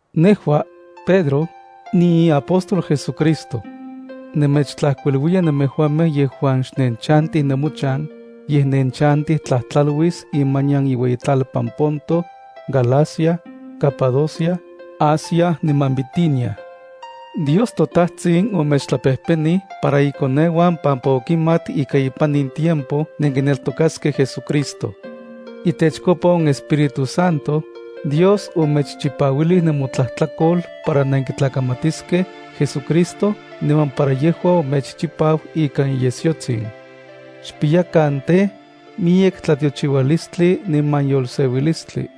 Nejua, Pedro, niiapóstol JesuCristo. Nemechtlajkuiluiya nemejuamej yejuan xnenchantij nemochan, yej nenchantij tlajtlauis imanian iueyitlalpan Ponto, Galacia, Capadocia, Asia niman Bitinia. Dios toTajtsin omechtlapejpenij para ikoneuan pampa okimat ika ipan in tiempo nenkineltokaskej JesuCristo. Itechkopa on Espíritu Santo, Dios omechchipauilij nemotlajtlakol para nenkitlakamatiskej JesuCristo niman para yejua omechchipau ikan iyesyotsin. Xpiyakan tej, miyek tlatiochiualistli niman yolseuilistli.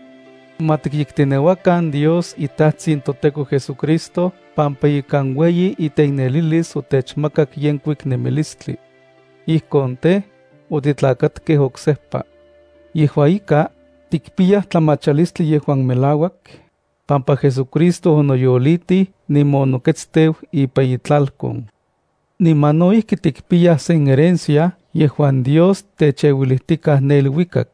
Ma tikyekteneuakan Dios iTajtsin toTEKO JesuCristo pampa ikan ueyi iteiknelilis otechmakak yenkuik nemilistli. Ijkon tej, otitlakatkej oksejpa. Yejua ika, tikpiyaj tlamachalistli yejuan melauak, pampa JesuCristo onoyolitij niman onoketsteu ipan itlalkon. Niman no ijki tikpiyaj sen herencia yejuan Dios techeuilijtikaj ne iluikak.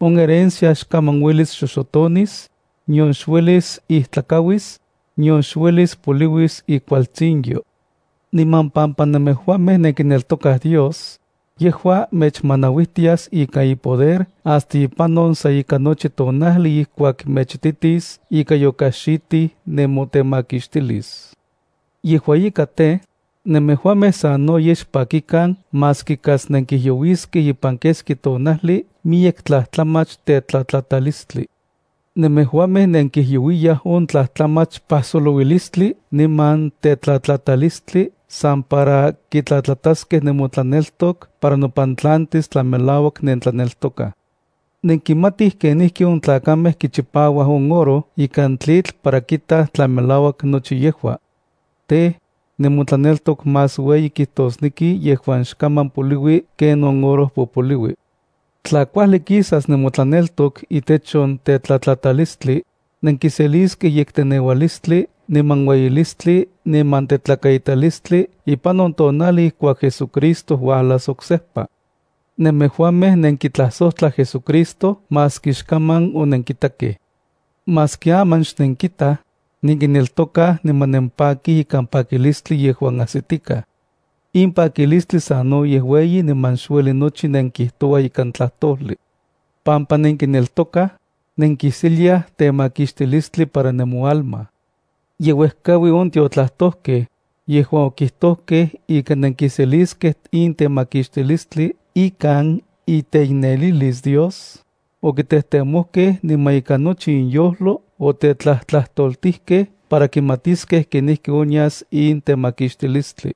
On herencia xkaman uelis xoxotonis, nion xuelis ijtlakauis, nion xuelis poliuis ikualtsinyo. Niman pampa nemejuamej nenkineltokaj Dios, yejua mechmanauijtias ikan ipoder hasta ipan on sa ika nochi tonajli ijkuak mechititis ika yokaxitij nemotemakixtilis. Yejua ika tej, nemejuamej sanoyej xpakikan maski kas nenkijyouiskej ipan keski tonajli miyek tlajtlamach tetlatlatalistli. Nemejuamej nenkijyouiyaj on tlajtlamach pajsolouilistli niman tetlatlatalistli san para kitlatlataskej nemotlaneltok para nopantlantis tla melauak nentlaneltokaj. Nenkimatij kenijki on tlakamej kichipauaj on oro ikan tlitl para kitaj tla melauak nochi yejua. Tej, nemotlaneltok más ueyi kijtosneki yejuan xkaman poliui ken on oro popoliui. Tla kuajli kisas nemotlaneltok itech on tetlatlatalistli, nenkiseliskej yekteneualistli niman ueyilistli niman tetlakaitalistli ipan on tonajli ijkuak JesuCristo uajlas oksejpa. Nemejuamej nenkitlajsojtlaj JesuCristo maski xkaman onenkitakej. Maski aman xnenkitaj, nenkineltokaj niman nempakij ikan pakilistli yejuan ajsitikaj. In pakilistli sanoyej ueyi niman xueli nochi nenkijtouaj ikan tlajtojli. Pampa nenkineltokaj, nenkiseliaj temakixtilistli para nemoalma. Ye uejkaui on tiotlajtojkej, yejuan okijtojkej ika nenkiseliskej in temakixtilistli ikan iteiknelilis Dios, okitejtemojkej niman ikan nochi inyojlo otetlajtlajtoltijkej para kimatiskej kenijki onyas in temakixtilistli.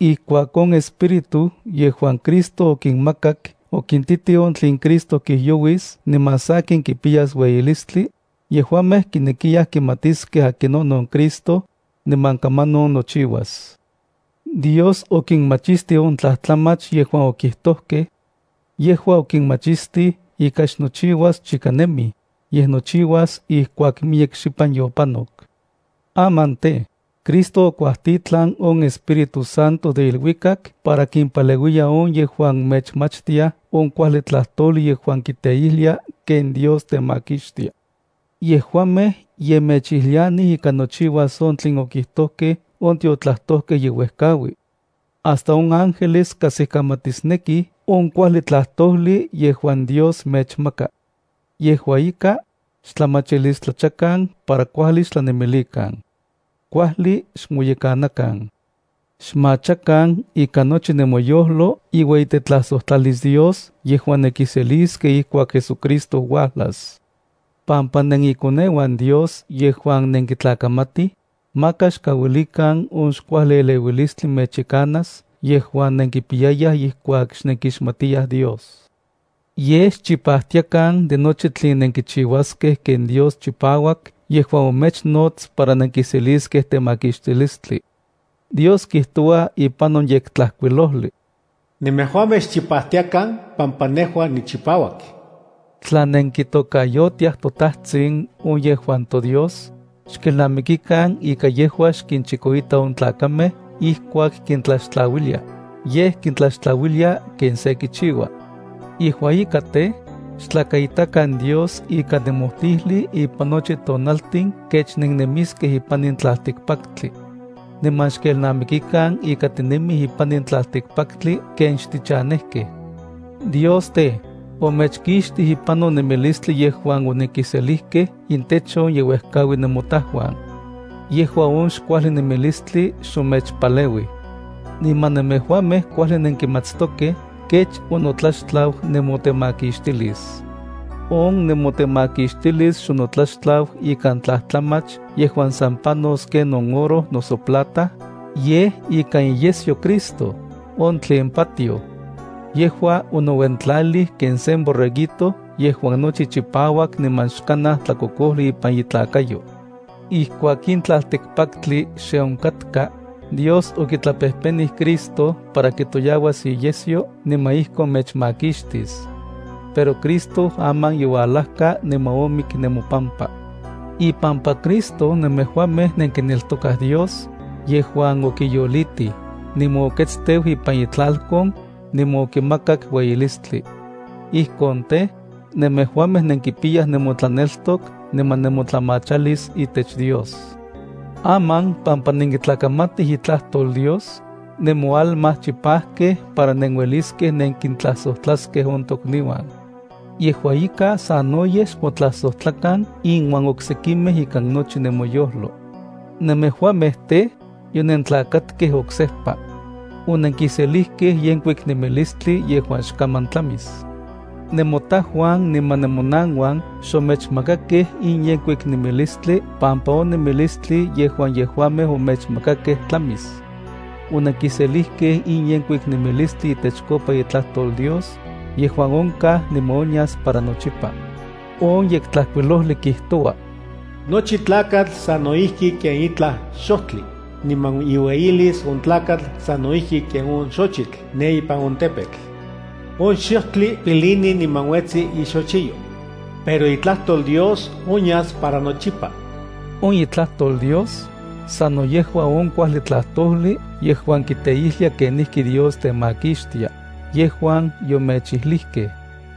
Ijkuak on Espíritu yejuan Cristo okinmakak okintitij on tlen Cristo kijyouis niman sakin kipiyas ueyilistli, yejuamej kinekiyaj kimatiskej akinonon Cristo, niman kamanon nochiuas. Dios okinmachistij on tlajtlamach yejuan okijtojkej. Yejua okinmachistij ika xnochiuas chika nemij, yej nochiuas ijkuak miyek xipan yopanok. Aman tej, Cristo okuajtitlan on Espíritu Santo de iluikak para kimpaleuiya on yejuan mechmachtiaj on kuajli tlajtojli yejuan kiteijlia ken Dios temakixtia. Yejuamej ye mechijlianij ika nochiuas on tlen okijtojkej on tiotlajtojkej ye uejkaui. Hasta on ángeles kajsikamatisnekij on kuajli tlajtojli yejuan Dios mechmaka. Yejua ika, xtlamachilistlachakan para kuajli xtlanemilikan. Kuajli xmoyekanakan. Xmachakan ikan nochi nemoyojlo iueyitetlajsojtlalis Dios yejuan nenkiseliskej ijkuak JesuCristo uajlas. Pampa nenikoneuan Dios yejuan nenkitlakamatij, maka xkauilikan on xkuajli eleuilistli mechyekanas yejuan nenkipiyayaj ijkuak xnenkixmatiyaj Dios. Yej xchipajtiakan de nochi tlen nenkichiuaskej ken Dios chipauak yejuan omechnots para nenkiseliskej temakixtilistli. Dios kijtoua ipan on Yektlajkuilojli: “Nemejuamej xchipajtiakan pampa nejua nichipauak.” Tla nenkitokayotiaj “toTajtsin” on yejuan toDios, xkelnamikikan ika yejua xkinchikoita on tlakamej ijkuak kintlaxtlauilia, yej kintlaxtlauilia ken se kichiua. Yejua ika tej, xtlakaitakan Dios ikan nemojtijli ipan nochi tonaltin kech nennemiskej ipan in tlaltikpaktli. Niman xkelnamikikan ika tinemij ipan in tlaltikpaktli ken xtichanejkej. Dios tej, omechkixtij ipan on nemilistli yejuan onenkiselijkej intech on ye uejkaui nemotajuan. Yejua on xkuajli nemilistli xomechpaleuij. Niman nemejuamej kuajli nenkimatstokej kech onotlaxtlau nemotemakixtilis. On nemotemakixtilis xonotlaxtlau ikan tlajtlamach yejuan san panos ken on oro noso plata, yej ikan iyesyo Cristo, on tlen patioj. Yejua onouentlalij ken sen borreguito yejuan nochi chipauak niman xkanaj tlakokojli ipan itlakayo. Ijkuak in tlaltikpaktli xe onkatka, Dios okitlapejpenij Cristo para kitoyauas iyesyo niman ijkon mechmakixtis. Pero Cristo aman youalajka niman omik nemopampa. Ipampa Cristo nemejuamej nenkineltokaj Dios, yejuan okiyolitij, niman oketsteu ipan itlalkon, niman okimakak ueyilistli. Ijkon tej, nemejuamej nenkipiyaj nemotlaneltok niman nemotlamachalis itech Dios. Aman pampa nenkitlakamatij itlajtol Dios, nemoalma chipajkej para nenueliskej nenkintlajsojtlaskej on tokniuan. Yejua ika sanoyej xmotlajsojtlakan inuan oksekimej ikan nochi nemoyojlo. Nemejuamej tej, yonentlakatkej oksejpa. Onenkiselijkej yenkuik nemilistli yejuan xkaman tlamis. Nemotajuan niman nemonanuan xomechmakakej in yenkuik nemilistli pampa on nemilistli yejuan yejuamej omechmakakej tlamis. Onenkiselijkej in yenkuik nemilistli itechkopa itlajtol Dios, yejuan onkaj niman onyas para nochipa. On Yektlajkuilojli kijtoua: Nochi tlakatl sano ijki ken itlaj xojtli, niman iueyilis on tlakatl sano ijki ken on xochitl ne ipan on tepetl. On xojtli pilini niman uetsi ixochiyo, pero itlajtol Dios onyas para nochipa. On itlajtol Dios, sano yejua on kuajli tlajtojli yejuan kiteijlia kenijki Dios temakixtia, yejuan yomechijlijkej.